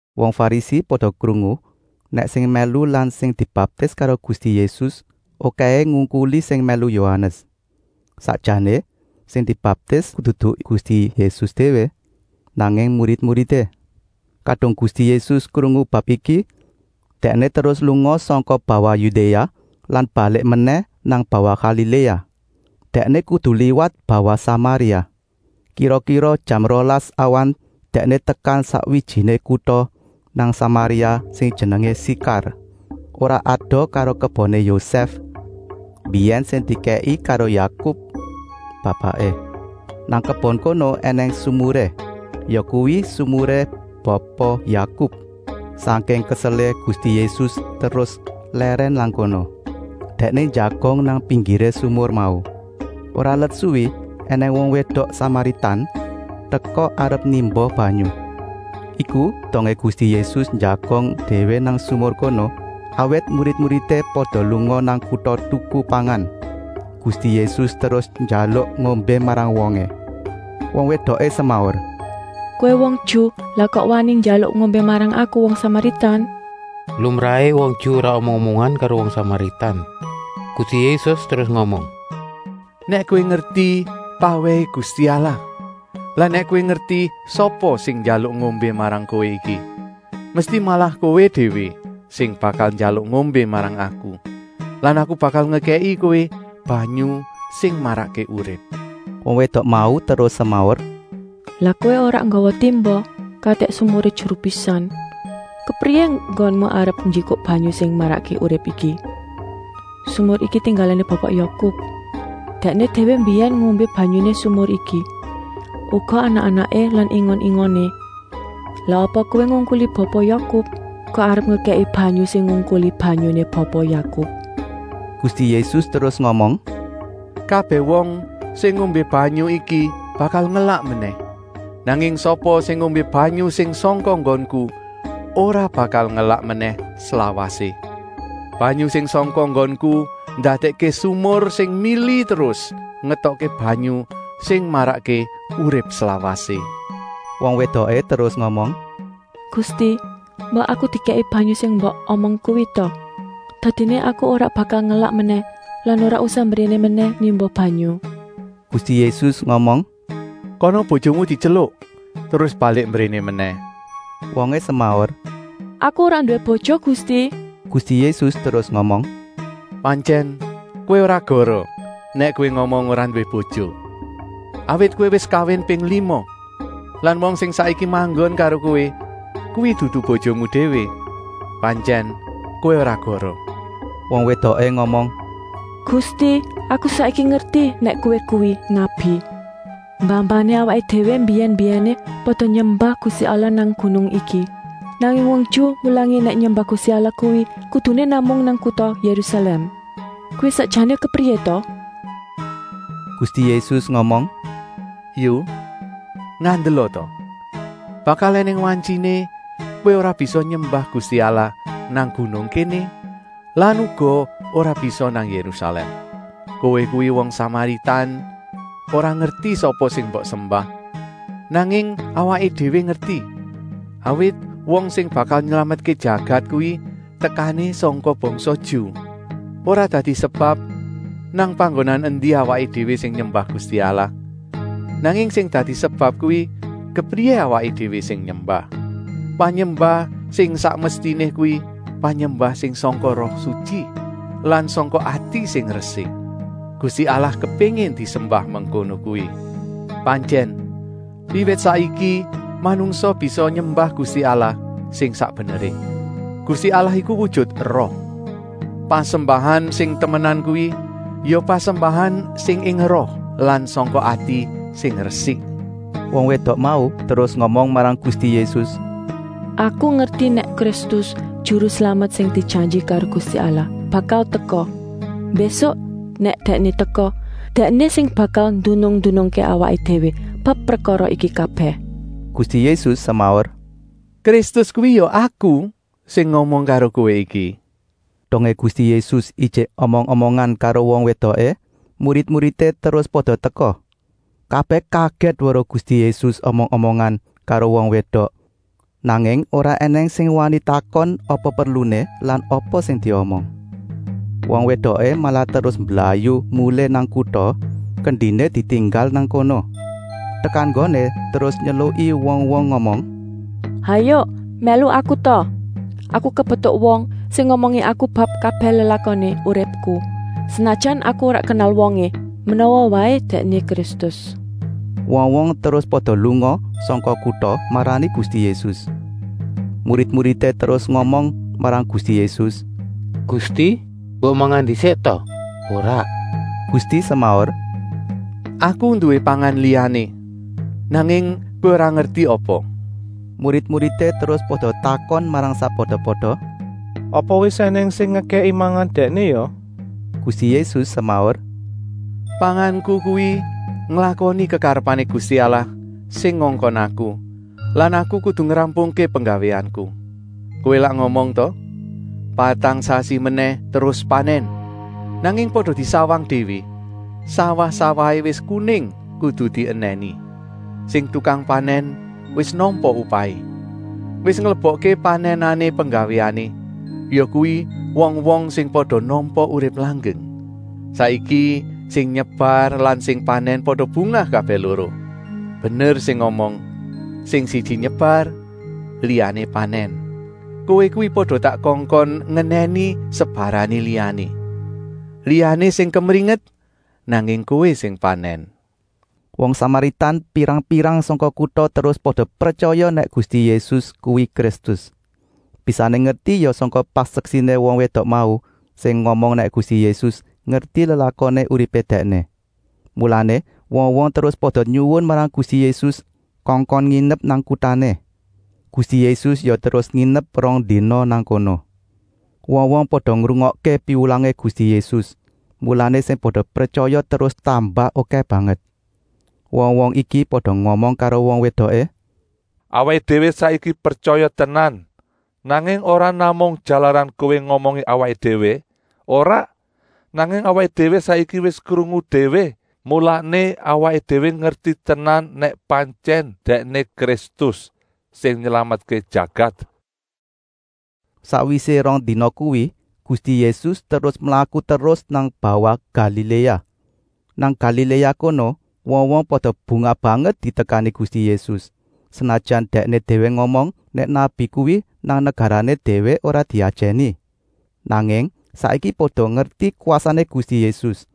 Wong Farisi pada krungu nèk sing mèlu lan sing dibaptis karo Gusti Yésus okèhé ngungkuli sing mèlu Yohanes. (Sakjané sing mbaptis dudu Gusti Yésus déwé, nanging murid-muridé.) Kadung Gusti Yésus krungu bab iki, Dèkné terus lunga sangka bawah Yudéa lan balik menèh nang bawah Galiléa. Dèkné kudu liwat bawah Samaria. Kira-kira jam rolas awan Dèkné tekan sakwijiné kuta nang Samaria sing jenengé Sikar, ora adoh karo keboné Yosèf mbiyèn sing dikèki karo Yakub, bapaké. Nang kebon kono ènèng sumuré, yakuwi sumuré Bapa Yakub. Sangking keselé, Gusti Yésus terus lèrèn nang kono. Dèkné njagong nang pinggiré sumur mau. Ora let suwi ènèng wong wédok Samaritan teka arep nimba banyu. Iku dongé Gusti Yésus njagong déwé nang sumur kono, awit murid-muridé pada lunga nang kuta tuku pangan. Gusti Yésus terus njaluk ngombé marang wongé. Wong wédoké semaur: “Kowé kuwi wong Ju, lah kok wani njaluk ngombé marang aku, wong Samaritan?” (Lumrahé wong Ju ora omong-omongan karo wong Samaritan.) Gusti Yésus terus ngomong: “Nèk kowé ngerti pawèhé Gusti Allah lan nèk kowé ngerti sapa sing njaluk ngombé marang kowé iki, mesti malah kowé déwé sing bakal njaluk ngombé marang Aku lan Aku bakal ngekèki kowé banyu sing marakké urip.” Wong wédok mau terus semaur: “Lah kowé ora nggawa timba, katik sumuré jeru pisan. Kepriyé enggonmu arep njikuk banyu sing marakké urip iki? Sumur iki tinggalané Bapa Yakub. Dèkné déwé mbiyèn ngombé banyuné sumur iki, uga anak-anaké lan ingon-ingoné. Lah apa kowé ngungkuli Bapa Yakub, kok arep ngekèki banyu sing ngungkuli banyuné Bapa Yakub?” Gusti Yésus terus ngomong: “Kabèh wong sing ngombé banyu iki bakal ngelak menèh, nanging sapa sing ngombé banyu sing sangka nggonku ora bakal ngelak menèh slawasé. Banyu sing sangka nggonku ndadèkké sumur sing mili terus ngetokké banyu sing marakké urip slawasé.” Wong wédoké terus ngomong: “Gusti, mbok aku dikèki banyu sing mbok omong kuwi ta! Dadiné aku ora bakal ngelak menèh lan ora usah mbréné menèh nimba banyu.” Gusti Yésus ngomong: “Kana bojomu dityeluk terus balik mbréné menèh!” Wongé semaur: “Aku ora nduwé bojo Gusti.” Gusti Yésus terus ngomong: “Pantyèn kowé ora goroh nèk kowé ngomong ora nduwé bojo. Awit kowé wis kawin ping lima lan wong sing saiki manggon karo kowé kuwi dudu bojomu déwé. Pantyèn kowé ora goroh!” Wong wédoké ngomong: “Gusti, aku saiki ngerti nèk Kowé kuwi nabi. Mbah-mbahané awaké déwé mbiyèn-mbiyèné pada nyembah Gusti Allah nang gunung iki. Nanging wong Ju mulangi nèk nyembah Gusti Allah kuwi kuduné namung nang kuta Yérusalèm. Kuwi sakjané kepriyé ta?” Gusti Yésus ngomong: “Yu, ngandela ta, bakal ènèng wantyiné kowé ora bisa nyembah Gusti Allah nang gunung kéné lan uga ora bisa nang Yérusalèm. Kowé kuwi wong Samaritan ora ngerti sapa sing mbok sembah, nanging awaké déwé ngerti, awit wong sing bakal nylametké jagat kuwi tekané sangka bangsa Ju. Ora dadi sebab nang panggonan endi awaké déwé sing nyembah Gusti Allah, nanging sing dadi sebab kuwi kepriyé awaké déwé sing nyembah. Panyembah sing sak mestiné kuwi panyembah sing sangka Roh Sutyi lan sangka ati sing resik. Gusti Allah kepéngin disembah mengkono kuwi. Pantyèn, wiwit saiki manungsa bisa nyembah Gusti Allah sing sak beneré. Gusti Allah iku wujut Roh. Pasembahan sing temenan kuwi ya pasembahan sing ing roh lan sangka ati sing resik.” Wong wédok mau terus ngomong marang Gusti Yésus: “Aku ngerti nèk Kristus, Juru Slamet sing dijanji karo Gusti Allah, bakal teka. Mbésuk nèk Dèkné teka, Dèkné sing bakal ndunung-ndunungké awaké déwé bab prekara iki kabèh.” Gusti Yésus semaur: “Kristus kuwi ya Aku, sing ngomong karo kowé iki!” Dongé Gusti Yésus ijik omong-omongan karo wong wédoké, murid-muridé terus pada teka. Kabèh kagèt weruh Gusti Yésus omong-omongan karo wong wédok, nanging ora ènèng sing wani takon apa perluné lan apa sing diomong. Wong wédoké malah terus mblayu mulih nang kuta, kendiné ditinggal nang kono. Tekan nggoné terus nyeluki wong-wong ngomong: “Hayuk mèlu aku ta! Aku kepetuk wong sing ngomongi aku bab kabèh lelakoné uripku, senajan aku ora kenal wongé. Menawa waé Dèkné Kristus!” Wong-wong terus pada lunga sangka kuta marani Gusti Yésus. Murid-muridé terus ngomong marang Gusti Yésus: “Gusti, mbok mangan ndisik ta?” “Ora,” Gusti semaur, “Aku nduwé pangan liyané, nanging kowé ora ngerti apa!” Murid-muridé terus pada takon marang sakpada-pada: “Apa wis ènèng sing ngekèki mangan Dèkné ya?” Gusti Yésus semaur: “Panganku kuwi nglakoni kekarepané Gusti Allah sing ngongkon Aku lan Aku kudu ngrampungké penggawéanku! Kowé lak ngomong ta: ‘Patang sasi menèh terus panèn.’ Nanging pada disawang déwé, sawah-sawahé wis kuning kudu dienèni. Sing tukang panèn wis nampa upahé. Wis nglebokké panènané penggawéané, yakuwi wong-wong sing pada nampa urip langgeng. Saiki sing nyebar lan sing panèn pada bungah kabèh loro. Bener sing ngomong: ‘Sing siji nyebar, liyané panèn.’ Kowé kuwi pada tak kongkon ngenèni sebarané liyané. Liyané sing kemringet, nanging kowé sing panèn.” Wong Samaritan pirang-pirang sangka kuta terus pada pretyaya nèk Gusti Yésus kuwi Kristus. Bisané ngerti ya sangka paseksiné wong wédok mau, sing ngomong nèk Gusti Yésus ngerti lelakoné uripé dèkné. Mulané wong-wong terus pada nyuwun marang Gusti Yésus kongkon nginep nang kutané. Gusti Yésus ya terus nginep rong dina nang kono. Wong-wong pada ngrungokké piwulangé Gusti Yésus, mulané sing pada pretyaya terus tambah okèh banget. Wong-wong iki pada ngomong karo wong wédoké: “Awaké déwé saiki pretyaya tenan, nanging ora namung jalaran kowé ngomongi awaké déwé, ora, nanging awaké déwé saiki wis krungu déwé. Mulané awaké déwé ngerti tenan nèk pantyèn Dèkné Kristus, sing nylametké jagat.” Sakwisé rong dina kuwi Gusti Yésus terus mlaku terus nang bawah Galiléa. Nang Galiléa kono wong-wong pada bungah banget ditekani Gusti Yésus, senajan Dèkné déwé ngomong nèk nabi kuwi nang negarané déwé ora diajèni. Nanging saiki pada ngerti kwasané Gusti Yésus,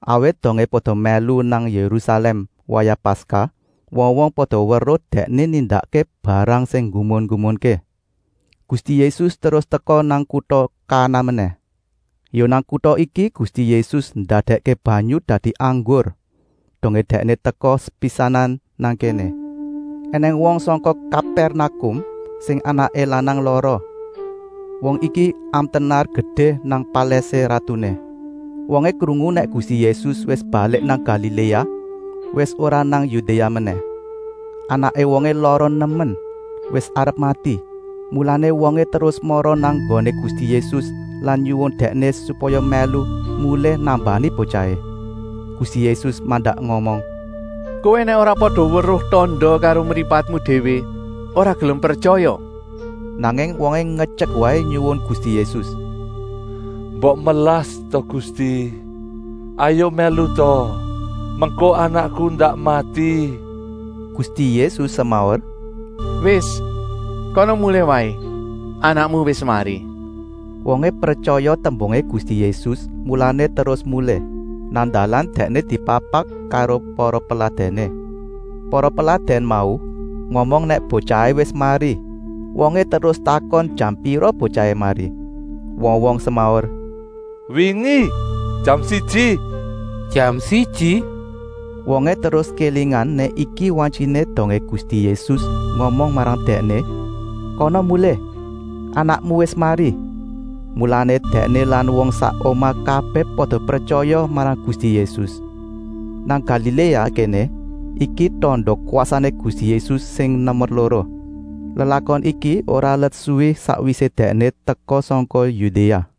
awit dongé pada mèlu nang Yérusalèm wayah Paskah wong-wong pada weruh Dèkné nindakké barang sing nggumun-nggumunké. Gusti Yésus terus teka nang kuta Kana menèh. Ya nang kuta iki Gusti Yésus ndadèkké banyu dadi anggur, dongé Dèkné teka sepisanan nang kéné. Enèng wong sangka Kapèrnakum sing anaké lanang lara. Wong iki amtenar gedé nang palèsé ratuné. Wongé krungu nèk Gusti Yésus wis balik nang Galiléa, wis ora nang Yudéa menèh. Anaké wongé lara nemen, wis arep mati, mulané wongé terus mara nang nggoné Gusti Yésus lan nyuwun Dèkné supaya mèlu mulih nambani botyahé. Gusti Yésus mandak ngomong: “Kowé nèk ora pada weruh tanda karo mripatmu déwé ora gelem pretyaya!” Nanging wongé ngetyek waé nyuwun Gusti Yésus: “Mbok melas ta Gusti, hayuk mèlu ta. Mengko anakku ndak mati!” Gusti Yésus semaur: “Wis, kana mulih waé. Anakmu wis mari.” Wongé pretyaya tembungé Gusti Yésus, mulané terus mulih. Nang dalan dèkné dipapak karo para peladèné. Para peladèn mau ngomong nèk botyahé wis mari. Wongé terus takon jam pira botyahé mari. Wong-wong semaur: “Wingi jam siji!” “Jam siji!” Wongé terus kélingan nèk iki wantyiné dongé Gusti Yésus ngomong marang Dèkné: “Kana mulih! Anakmu wis mari!” Mulané dèkné lan wong sak omah kabèh pada pretyaya marang Gusti Yésus. Nang Galiléa kéné iki tanda kwasané Gusti Yésus sing nomer loro. Lelakon iki ora let suwi sakwisé Dèkné teka sangka Yudéa.